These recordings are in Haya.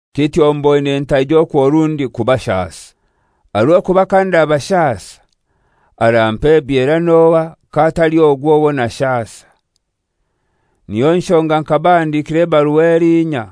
Kityo mboine ntaija okwo rundi kubashasa. Aha rw'okuba kandabashasa, arampa ebyera n'ohai k'atali ogwo owo nashasa? Niyo nshonga nkabahandikira ebarua elinya.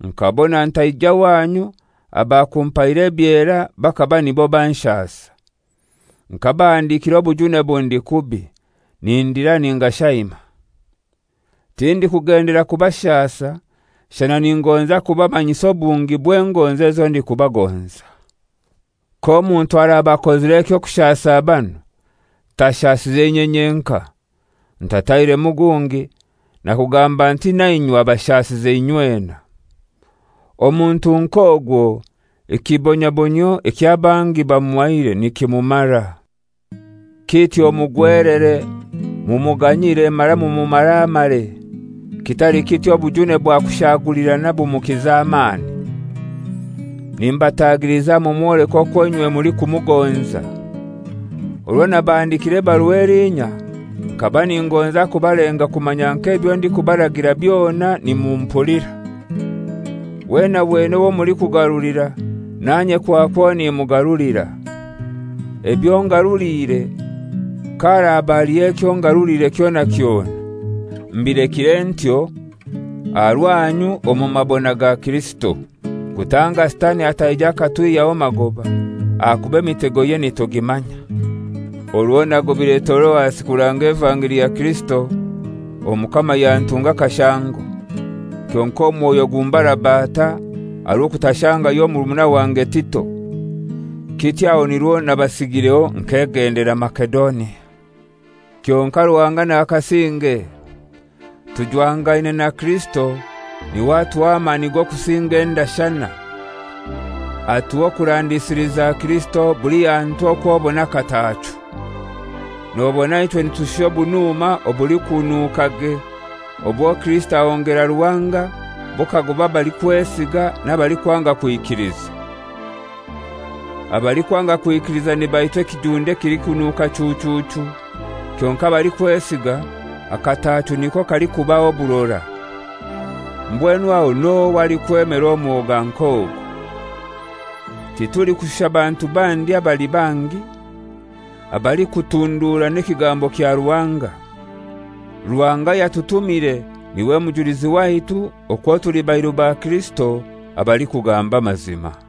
Nkabona ntaija wanyu abakumpaire ebyera bakaba nibo banshasa. Nkabahandikira obujune bundi kubi, nindira ningashaima. Tindikugendelera kubashasa, shana ningonza kubamanyisa obungi bw'engonzi ezo ndikubagonza. K'omuntu araba akozire eky'okushasa banu, tashasize inye nyenkai. Ntatairemu gungi nakugamba nti na inywe abashasize inywena. Omuntu nk'ogwo ekibonabonyio eky'abangi bamuhaire nikimumara. Kityo mugwelere mumuganyire mara mumumaramare, kitali kityo obujune bwakushagulirana bumukiza amani. Nimbatagiliza mumwoleke okwo inywe mulikumugonza. Orwo nabahandikiire ebarua elinya, nkaba ningonza kubalenga kumanya nk'ebyo ndikubaragira byona nimumpulira. Wena wena owo mulikugarulira, nanye kwakwo nimugarulira. Ebyo ngarulire, kaharaba haliyo ekyo ngarulire kyona kyona, mbilekire aha rwanyu omu mabona ga Kirisito kutanga Sitani ataija akatwihyaho magoba, ahakuba emitegoye nitugimanya. Orwo nagobire Toroasi kuranga evangeli ya Kirisito, Omukama yantunga akashango; kyonkai omwoyo gumbarabata aha rw'okutashangayo murumuna wange Tito. Kityo aho nirwo nabasigireho nkegendera Masedonia. Kyonkai Ruhanga nakasinge. Tujwangaine na Kirisito n'iwe atuha amani g'okusinga endashana. Atuha okurandisiliza Kirisito buli hantu okw'obona akataachu. Nobona ichwe nitushusha obunuma obulikununukage obwo Kirisito ahongera Ruhanga bukagoba abalikwesiga n'abalikwanga kwikiliza. Abalikwanga kwikiliza nibaitwa ekijunde ekilikunuka chuchuchu; kyonkai abalikwesiga, akataachu niko kalikubaha oburora. Mbwenu aho n'ohai alikwemera omwoga nk'ogu? Titulikushusha bantu bandi abali bangi, abalikutundurana ekigambo kya Ruhanga. Ruhanga ayatutumire n'iwe mujulizi waitu okwo tuli bairu ba Kirisito abalikugamba amazima.